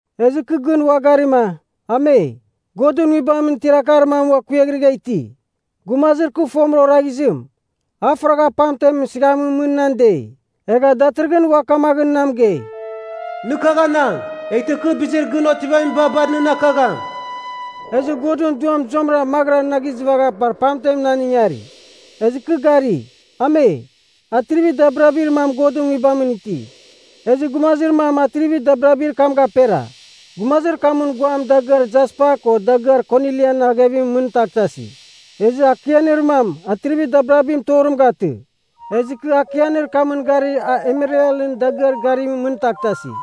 Ezɨ kɨ gɨn ua garima, Ame! Godɨn Nguibamɨn tiar akar mam kuiaghrɨgha iti. Gumazir kɨ fomɨra oraghizim, a faragha pamten sɨghamɨn mɨn nan dei, egha datɨrɨghɨn ua kamaghɨn na mɨgei, “Nɨ kagh anang, eghtɨ kɨ bizir gɨn otivamiba bar nɨn akakagham.” Ezɨ Godɨn Duam zuamɨra maghɨra na gizɨvagha bar pamten nan ingari, ezɨ kɨ gari, Ame! Atrivir dabirabir mam Godɨn Nguibamɨn iti, ezɨ gumazir mam atrivir dabirabir kam gapera. Gumazir kamɨn guam dagɨar jaspa ko dagɨar konilian aghevimɨn mɨn taghtasi. Ezɨ akianir mam, atrivir dabirabim torim gatɨ, ezɨ kɨ akianir kamɨn gari a emeralɨn dagɨar garimɨn mɨn taghtasi.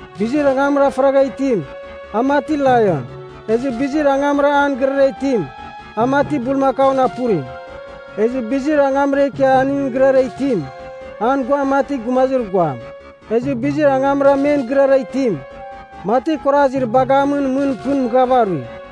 Bizir angamra faragha itim, a mati laion. Ezɨ bizir angamra an gɨrara itim, a mati bulmakaun apurim. Ezɨ bizir angamra ikia aningɨn gɨrara itim, an guam mati gumazir guam. Ezɨ bizir angamra men gɨrara itim, mati kuarazir bagamɨn mɨn pɨn mɨghava arui.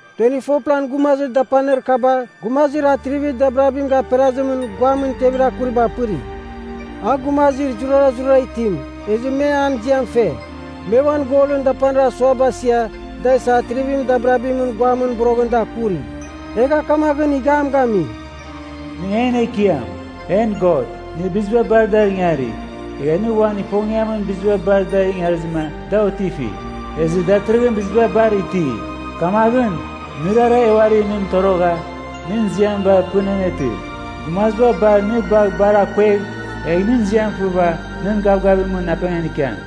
24plan gumazir dapanir kaba gumazir atrivir dabirabim gaperazimɨn guamɨn tevir akuriba apɨri. A gumazir zurazurara itim ezɨ me an ziam fe. Me uan golɨn dapanir asuaba asia da isa atrivir dabirabimɨn guamɨn boroghɨn da akuri. Egha kamaghɨn ighiam gami, “Nɨ en Ekiam, en God. Nɨ biziba bar dar ingari. Egha nɨ uan ifongiamɨn, biziba bar dar ingarizɨma da otifi, ezɨ datɨrɨghɨn biziba bar iti. Kamaghɨn, nɨrara e uari nɨn itorogha nɨn ziam bar pɨn anetɨ. Gumaziba bar nɨ bagh bar akuegh, egh nɨn ziam fɨva nɨn gavgavimɨn apengan ikiam.”